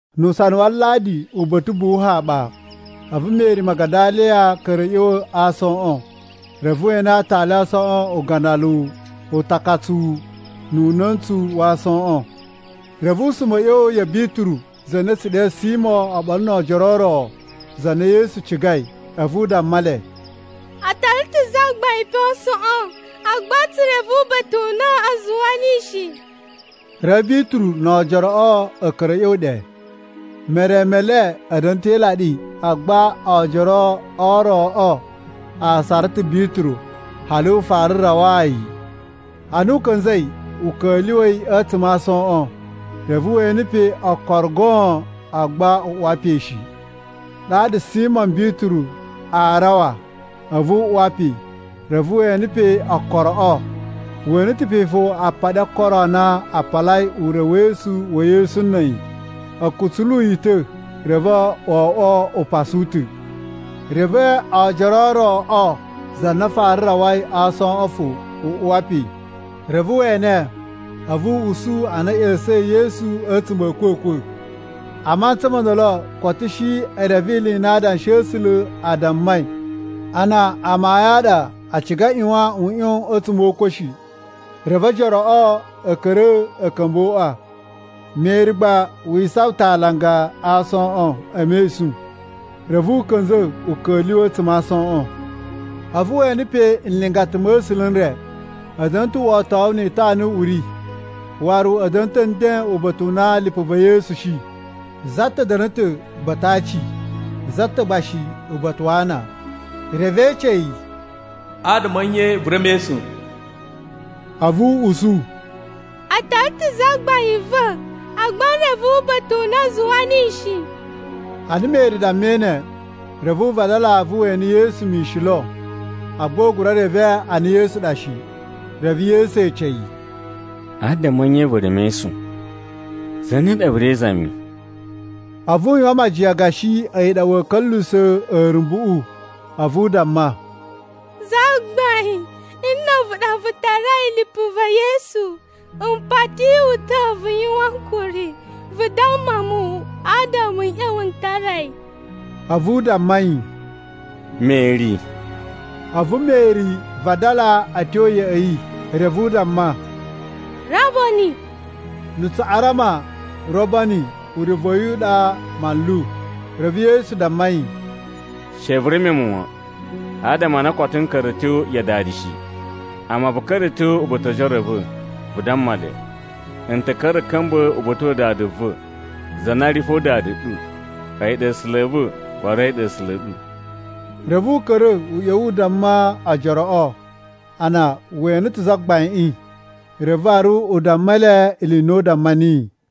Nu usana wa Aladi uba̱ta̱ ubuwu haɓa, a̱vu Meri Magadaliya ka̱ra̱ a̱ ꞌya̱wa̱ a aasoꞌon, reve we ene aatali a aasoꞌon ugandaluwu utakatsuwu nu una̱ntsu wa aasoꞌon. Reve u suma a̱ ꞌya̱wa̱ ya̱ Bituru za na a̱tsu ɗe Simo oɓolo no oojoro o ro, za na Yesu cigai, a̱vu u damma le, “A tara ta̱ Zagbain pe a aasoꞌon, agba tsu reve uba̱ta̱ u na a zuwa niyi shi!” Reve Bituru no oojoroꞌo a̱ ka̱ra̱ a̱ ꞌya̱wa̱ ɗe. Mere me le a̱ da̱na̱ ta̱ e ilaɗi, agba oojoro o roꞌo a sara ta̱ Bituru hali u fara rawaa yi. Ana u ka̱nza̱ u ka̱lyuwa̱i a̱tsuma̱ a aasoꞌon, reve we ene pe okoro goon, agba u uwa pe shi. Ɗaɗa Simo Bituru a rawa a̱vu u uwa pe, reve we ene pe okoroꞌo. We ene ta̱ fo apaɗi o okoro a na a palayi urewesu wa̱ Yesu na̱ a̱yi. A̱ kutsulu yi ta̱, reve wo oꞌwo upasu u ta̱. Reve oojoro o roꞌo, za na fara rawai a aasoꞌon fo u uwa pe. Reve we ene a̱vu u usu a na a̱ ꞌya̱sa̱in Yesu a̱tsuma̱ a̱ a̱kwa̱kwa̱. (A mantsa mo ndolo koto a̱ shi e reve ili i na Adanshi a̱ A̱sula̱ a dammai a na amayun a ɗa a ciga a ꞌyuwan u ꞌyon a̱tsuma̱ o ukwa̱ shi.) Reve ojoroꞌo a̱ ka̱ra̱ a̱ ka̱mba̱ o uꞌwa. Meri gba wi isawan ta̱ a alanga a aasoꞌon e mesun. Reve u ka̱nza̱ u ka̱lyuwa̱ a̱tsuma̱ a aasoꞌon. A̱vu we ene pe nlingata ma̱ A̱sula̱ n re. A̱ da̱na̱ ta̱ wotowu ni itana i uri waru a̱ da̱na̱ ta̱ nden uba̱ta̱ u na lipu va̱ Yesu shi. Za ta̱ da̱na̱ ta̱ uba̱ta̱ a aaci za ta̱ gba shi uba̱ta̱ wa ana. Reve e ece yi, “Adama a̱ nye vu ri e mesun?” A̱vu u usu, “A tara ta̱ Zagbain va̱, agba n reve uba̱ta̱ u na a zuwa niyi shi.” Ana Meri dammai ne, reve u vadala a̱vu we ene Yesu mishin lo, agba u gura reve a na Yesu ɗa shi. Reve Yesu ece yi, “Adama a̱ nye vu ri e mesun? Zane ɗa vu ri e izami?” A̱vu u yuwan majiyan gashi a̱yi ɗa wa̱a̱ ka̱lyuwusa̱ a̱a̱rumbuꞌu a̱vu u damma, “Zagbain, nna̱ a̱vu ɗa vu tarai lipu va̱ Yesu, m pati wu ta̱ vu yuwan ankuri, vu damma mu, adama n ꞌya̱wa̱ n tara yi.” A̱vu u damma yi, “Meri.” A̱vu Meri vadala a̱ tyo ya̱ꞌa̱ yi, reve u damma, “Rabboni!” (Na̱ Tsuꞌarama “Rabboni” urevu wa̱ yi a̱yi ɗa “Manlu.”) Reve Yesu damma yi, “She vu reme mu wan, adama a na koto n ka̱ra̱ a̱ tyo ya Dada shi. Amma vu ka̱ra̱ a̱ tyo uba̱ta̱ o ojoro a̱ va̱ vu damma le, ‘N ta̱ ka̱ra̱ a̱ ka̱mba̱ uba̱ta̱ wa Dada va̱ za na ri fo Dada ɗu. A̱yi ɗa A̱sula̱ a̱ va̱, waru a̱yi ɗa A̱sula̱ a̱ ɗu.’” Reve u ka̱ra̱ u ꞌya̱wa̱ u damma ojoroꞌo a na we ene ta̱ Zagbaiꞌin. Reve waru u damma le ili i u damma niyi.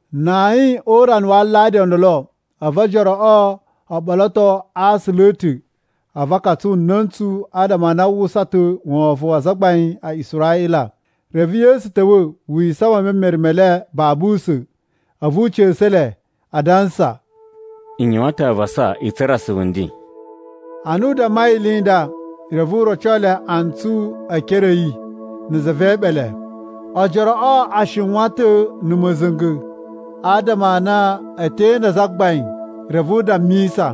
Na ayin o urana wa Aladi o ndolo, a̱vu ojoroꞌo o ɓoloto a aasula a̱ ta̱ a̱vu a katsu na̱ntsu, adama a na a uwwusa ta̱ wovon wa azagbain a Israꞌila. Reve Yesu ta̱wa̱ wi isawan e memere me le babu usa̱n, a̱vu u ca̱sa̱ le, adansa, “N yuwan ta̱ avasa i tsura̱ asuvu nden.” Ana u dammai ili i nda, reve u roco le antsu e ekere a̱ yi na̱ za ve eeɓele. Ojoroꞌo a shiwan ta̱ na̱ ma̱za̱nga̱ adama a na e te inda Zagbain. Reve u dammisa,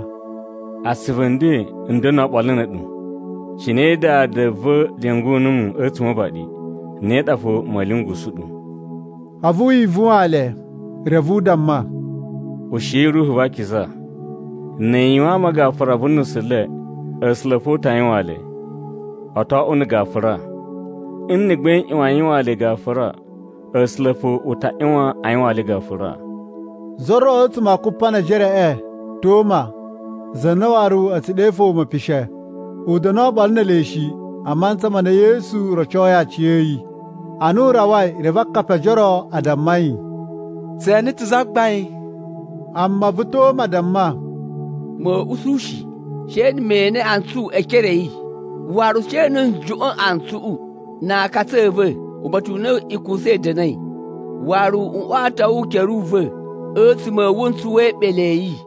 “Asuvu nden n da̱na̱ oɓolo na̱ a̱ɗu. Cine Dada va̱ lyungu numu a̱tsuma̱ o uvaɗi, ne ɗa fo ma̱a̱ lyungusu ɗu.” A̱vu wi ivuwaan le reve u damma, “Ushiyi Ruhu va Akiza. Nni i yuwaan ama gafura vu nusu le, A̱sula̱ fo u ta yuwaan le, o to oꞌwo na̱ gafura. Nna̱ gba i ꞌyuwan a yuwaan le gafura, A̱sula̱ fo u ta ꞌyuwan a yuwaan le gafura.” Za ro a̱tsuma̱ a Kupanejereꞌe, Toma (za na waru a̱ tsu ɗe fo Mepishe), u da̱na̱ oɓolo ne ele shi, a mantsa ma na Yesu rocoi aciya̱yi. Ana u rawai, reve akapi o ojoro a damma yi, “Tse ene ta̱ Zagbain!” Amma a̱vu Toma damma, “Ma̱a̱ usu shi she na̱ me ene antsu e ekere a̱ yi, waru she na̱ n juꞌwa̱n antsuꞌu na aakatsu a̱ va̱ uba̱ta̱ u na ikusa i da̱na̱i, waru n oto ukere u va̱ a̱tsuma̱ a̱ wuntsu we eeɓele a̱ yi.”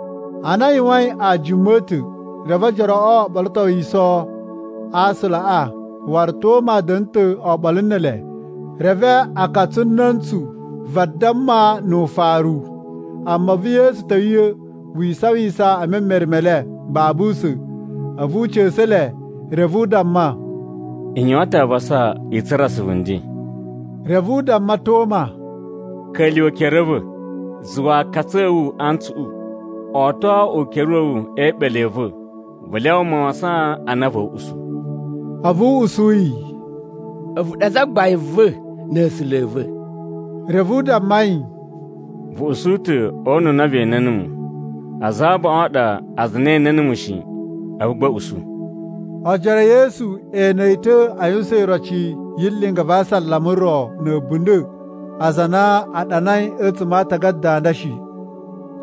Ana a yuwain ajuma a̱ ta̱, reve ojoroꞌo o ɓolotowiso a aasulaꞌa, waru Toma da̱na̱ ta̱ oɓolo ne ele. Reve a katsu na̱ntsu vadamma nu ufaru, amma a̱vu Yesu ta̱wa̱ wi isawisan e memere me le babu usa̱n. A̱vu u ca̱sa̱ le, reve u damma, “N yuwan ta̱ avasa i tsura̱ asuvu nden.” Reve u damma Toma, “Ka̱lyuwa̱ ekere a̱ va̱. Zuwa aakatsu a̱ wu antsuꞌu. Oto ukere wa̱ wu e eeɓele a̱ va̱. Vu lyawa mawasan a na va̱a̱ usu.” A̱vu u usu yi, “A̱vu ɗa Zagbain va̱ na̱ A̱sula̱ a̱ va̱.” Reve u damma yi, “Vu usu ta̱ o una̱ na ve ene numu. Aza abaꞌun a ɗa aza a na e ene numu shi a̱vu gba a̱ usu.” Ojoro e Yesu e ene yi ta̱ a yuwusan iroci yi linga va asalama ro na̱ a̱bunda̱ aza a na a ɗanai a̱tsuma̱ a aatagada a nda shi.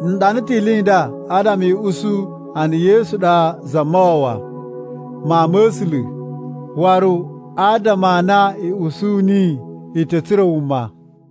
N ɗana ta̱ ili i nda adama i usu a na Yesu ɗa Zamawawa, Mawun ma̱ A̱sula̱, waru adama a na i usu niyi, i ta̱ tsura̱ wuma.